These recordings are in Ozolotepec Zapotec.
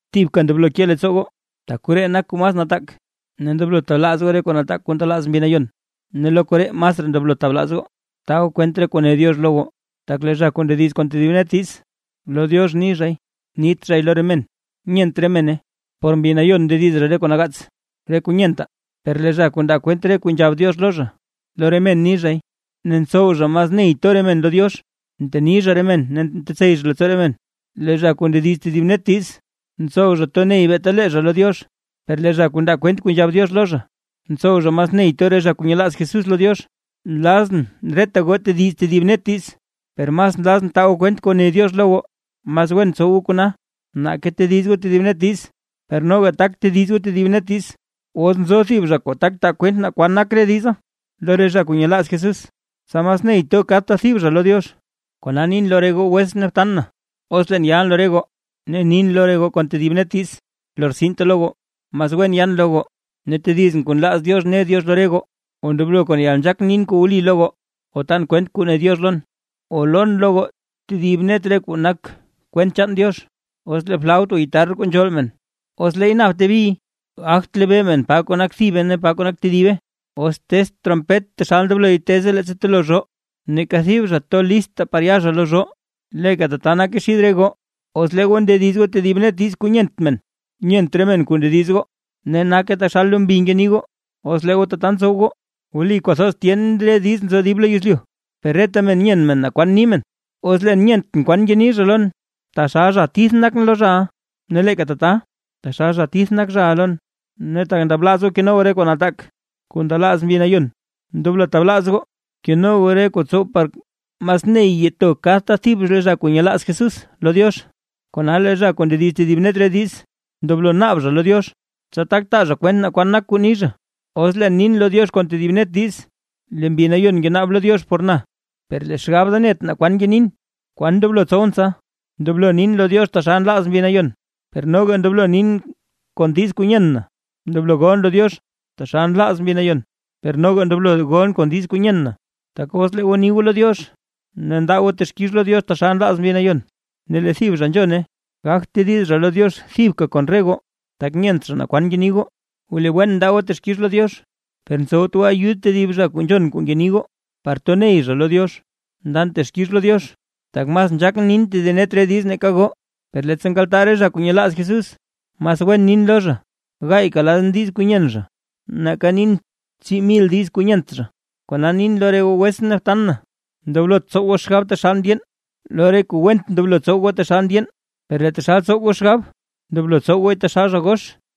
Thibka ndoblo ke leettsoo goo, tak koree nak kuu mas nataak. Ne ndoblo tablaaz goo re kuu nataak kuu ndelaaz Mbi Nayon, ne lo re koree masraa ndoblo tablaaz goo, taa goo kwent re kuu ne Diox lo goo. Tak lee zha kuu ndediz kon tedib net diiz, lo Diox ni zhay, nit zhay lo re men, nyent re mene. Por Mbi Nayon ndediz zha re kuu nagaats re kuu nyentaa. Per lee zha kuu ndaa kwent re kuu nzhab Diox lo zha, lo re men ni zhay ne ntsow zha mas ney to re men lo Diox, nteni zha re men ne ntetsey zha leettsoo re men. Lee zha kuu ndediz tedib net diiz, ntsow zha to ney beeta lee zha lo Diox, per lee zha kuu ndaa kwent kuu nzhab Diox lo zha, ntsow zha mas ney to re zha kuu nyelaaz Jesús lo Diox. Nlazʼn reta goo tediz tedib net diiz, per mas nlazʼn taa goo kwent kuu ne Diox lo goo, mas wen tsow goo kona, nake tediz goo tedib net diiz. Per noga tak tediz goo tedib net diiz, os nzo thib zha kuu taa kwent naa kwan nak re diza lo re zha kuu nyelaaz Jesús, tsa mas ney to kadta thib zha lo Diox. Kona nin lo re goo wetsʼn ne btan na, os leen yalʼn lo re goo ne nin lo goo kon tedib net diiz, lortsinte lo goo, mas wen yan lo goo ne tedizʼn kuu nlaaz Diox ne Diox lo re goo, o ndoblo kon yalnzhaak nin kuu wli lo goo, o tan kwent kuu ne Diox lon, o lon lo goo tedib net re kuu nak kwent chaan Diox. Os lee flaut o guitarr kuu nzhool men, os leey napte biy gagt lebee men pa kuu nak thibe ne pa kuu nak tedibe. Os tezt trompet taxal ndobloy teze leettsa telo zhoo, neeka thib zha to lista par ya zha lo zhoo. Leeka tata nake xid re goo, os lee goo ndediz goo tedib net diiz kuu nyent men, nyent re men kuu ndediz goo. Ne nake taxal lo mbi ngeni goo, os lee goo tata ntsow goo. Wli kwathoz tyen re diiz nzo dib lo yezlyu, per reta men nyen men naa kwan ni men. Os leen nyentʼn kwan ngeni zha lon, taxal zha tith nakʼn lo zhaʼa, ne leeka tata taxal zha tith nak zhaʼa lon. Ne tak ndablaaz goo keno goo re kuu nataak kuu ndelaaz Mbi Nayon, ndoblo tablaaz goo, keno goo re kuu tsow par mas ney to kadta thib re zha kuu nyelaaz Jesús lo Diox. Kona lee zha kuu ndediz tedib net re diiz, ndoblo naab zha lo Diox, tsa tak taa zha kwent naa kwan nak kuu ni zha. Os leen nin lo Diox kon tedib net diiz, lee Mbi Nayon ngenaab lo Diox por na, per lee xgab da net naa kwan ngenin. ¿Kwan ndoblo tsowʼn tsa? Ndoblo nin lo Diox taxal nlaaz Mbi Nayon, per noga ndoblo nin kon diiz kuu nyen na. Ndoblo golʼn lo Diox taxal nlaaz Mbi Nayon, per noga ndoblo golʼn kon diiz kuu nyen na. Tak os lee goo ni goo lo Diox ne ndaa goo texkix lo Diox taxal nlaaz Mbi Nayon ne lee thib zha nzhone, gagt tediz zha lo Diox thibka kon re goo, tak nyent zha naa kwan ngeni goo. Wli wen ndaa goo texkix lo Diox, per ntsowt goo ayud tedib zha kuu nzhon kuu ngeni goo, par to ney zha lo Diox. Ndan texkix lo Diox, tak mas nzhaakʼn nin tedib net ree diiz nake goo; per leettsa nkaltaa re zha kuu nyelaaz Jesús, mas wen nin lo zha gaayka lan diiz kuu nyen zha nake nin tsii mil diiz kuu nyent zha. Kona nin lo re goo wetsʼn ne btan na, ndoblot tsow goo xgab taxal ndyeen, lo re kuu went ndoblo tsow goo taxal ndyeen, per lee taxal tsow goo xgab ndoblo tsow gooy taxal zha gox.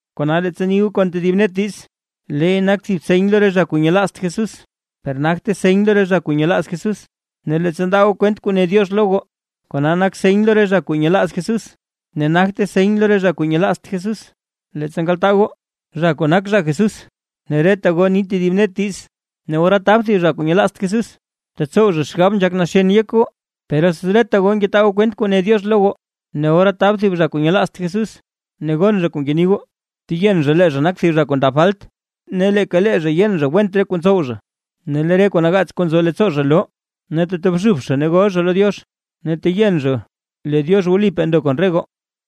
Kona leettsa ni goo kon tedib net diiz, leey nak thib seny lo re zha kuu nyelaazt Jesús, per nagte seny lo re zha kuu nyelaaz Jesús. Ne leettsa ndaa goo kwent kuu ne Diox lo goo, kona nak seny lo re zha kuu nyelaaz Jesús, ne nagte seny lo re zha kuu nyelaazt Jesús. Leettsa nkaltaa goo, zha kuu nak zha Jesús, ne reta goo ni tedib net diiz, ne ora tab thib zha kuu nyelaazt Jesús, tetsow zha xgab nzhak naxen yek goo. Per os reta goo ngetaa goo kwent kuu ne Diox lo goo, ne ora tab thib zha kuu nyelaazt Jesús ne gon zha kuu ngeni goo, teyen zha lee zha nak thib zha kuu ndab falt, ne leeka lee zha yen zha went re kuu ntsow zha. Ne lee re kuu nagaats kuu nzo leettsoo zha loo, ne tetobxub zha ne gol zha lo Diox, ne teyen zha lee Diox wlipaa ndo kon re goo.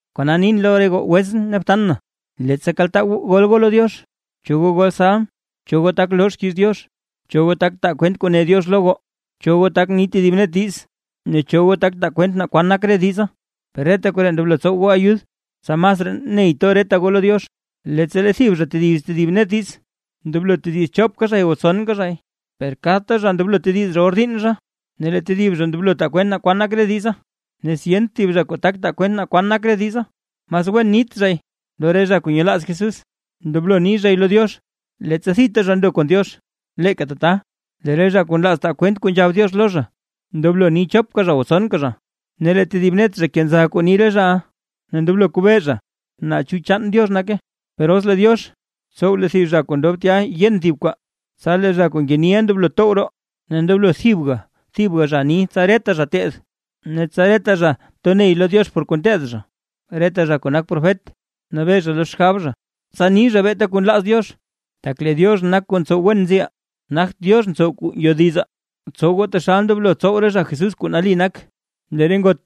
Kona nin lo re goo wetsʼn ne btan na, leettsa kaltaa goo gol goo lo Diox, cho goo gol salm, cho goo tak loo xkiiz Diox, cho goo tak taa kwent kuu ne Diox lo goo, cho goo tak ni tedib net diiz ne cho goo tak taa kwent naa kwan nak re diza, per reta koree ndoblo tsowe ayud, tsa masraa ney to reta goo lo Diox. Leettsa lee thib zha tediz tedib net diiz, ndoblo tediz chopka zhay o tsonka zhay, per kadta zha ndoblo tediz zha or diinn zha; ne lee tedib zha ndoblo taa kwent naa kwan nak re diza. Ne os yent thib zha kuu tak taa kwent naa kwan nak re diza, mas wen nit zhay lo re zha kuu nyelaaz Jesús, ndoblo ni zhay lo Diox leettsa thita zha ndo kon Diox. Leeka tata, lee re zha kuu nlaaz taa kwent kuu nzhab Diox lo zha, ndoblo ni chopka zha o tsonka zha, ne lee tedib net zha kenza kuu ni re zhaʼa, ne ndoblo kobee zha naa chu chaan Diox nake. Per os lee Diox, tsow lee thib zha kuu ndob tya yen thib kwaa, tsa lee zha kuu ngeniʼa ndoblo tow roo. Ne ndoblo thibga thibga zha ni tsa reta zha teed, ne tsa reta zha to ney lo Diox. Reta zha kuu nak profet, nabee zha lo xgab zha, tsa ni zha beeta kuu nlaaz Diox, tak lee Diox nak kuu ntsow wen nziʼaa, nagt Diox kuu ntsow ngyodizaa. Btsow goo taxal ndoblo tsow re zha Jesús kuu nali nak, lee re ngot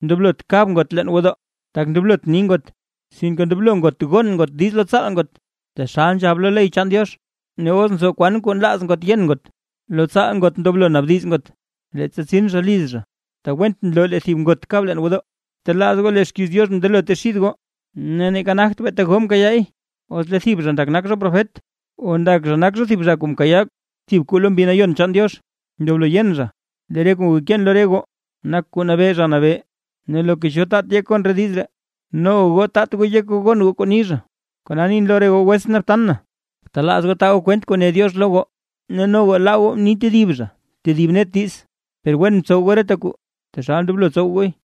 ndoblot kab ngot leen gwodoo, tak ndoblot ni ngot. Sinke ndoblo ngot gon ngot diiz lo tsaal ngot, taxal nzhab lo ley chaan Diox. Ne os nzo kwan kuu nlaaz ngot yen ngot, lo tsaal ngot ndoblo naabdiz ngot, leettsa tsin zha liz zha; tak went nloo lee thib ngot kab leen gwodoo. Btelaaz goo lee xkiiz Diox mndelote xid goo, ne neeka nagt beeta goo mkayaay. Os lee thib zha ndak zha nak zha profet, o ndak zha nak zha thib zha kuu mkayaa thib kuu lo Mbi Nayon chaan Diox, ndoblo yen zha, lee re kuu ngekeen lo re goo, nak kuu nabee Zha Nabee. Ne loka cho taat yek gon diiz ree, noga goo taat goo yek goo gon goo kuu ni zha. Kona nin lo re goo wetsʼn ne btan na, btablaaz goo taa goo kwent kuu ne Diox lo goo, ne noga laa goo ni tedib zha tedib net diiz, per wen btsow goo reta kuu taxal ndoblo tsow gooy.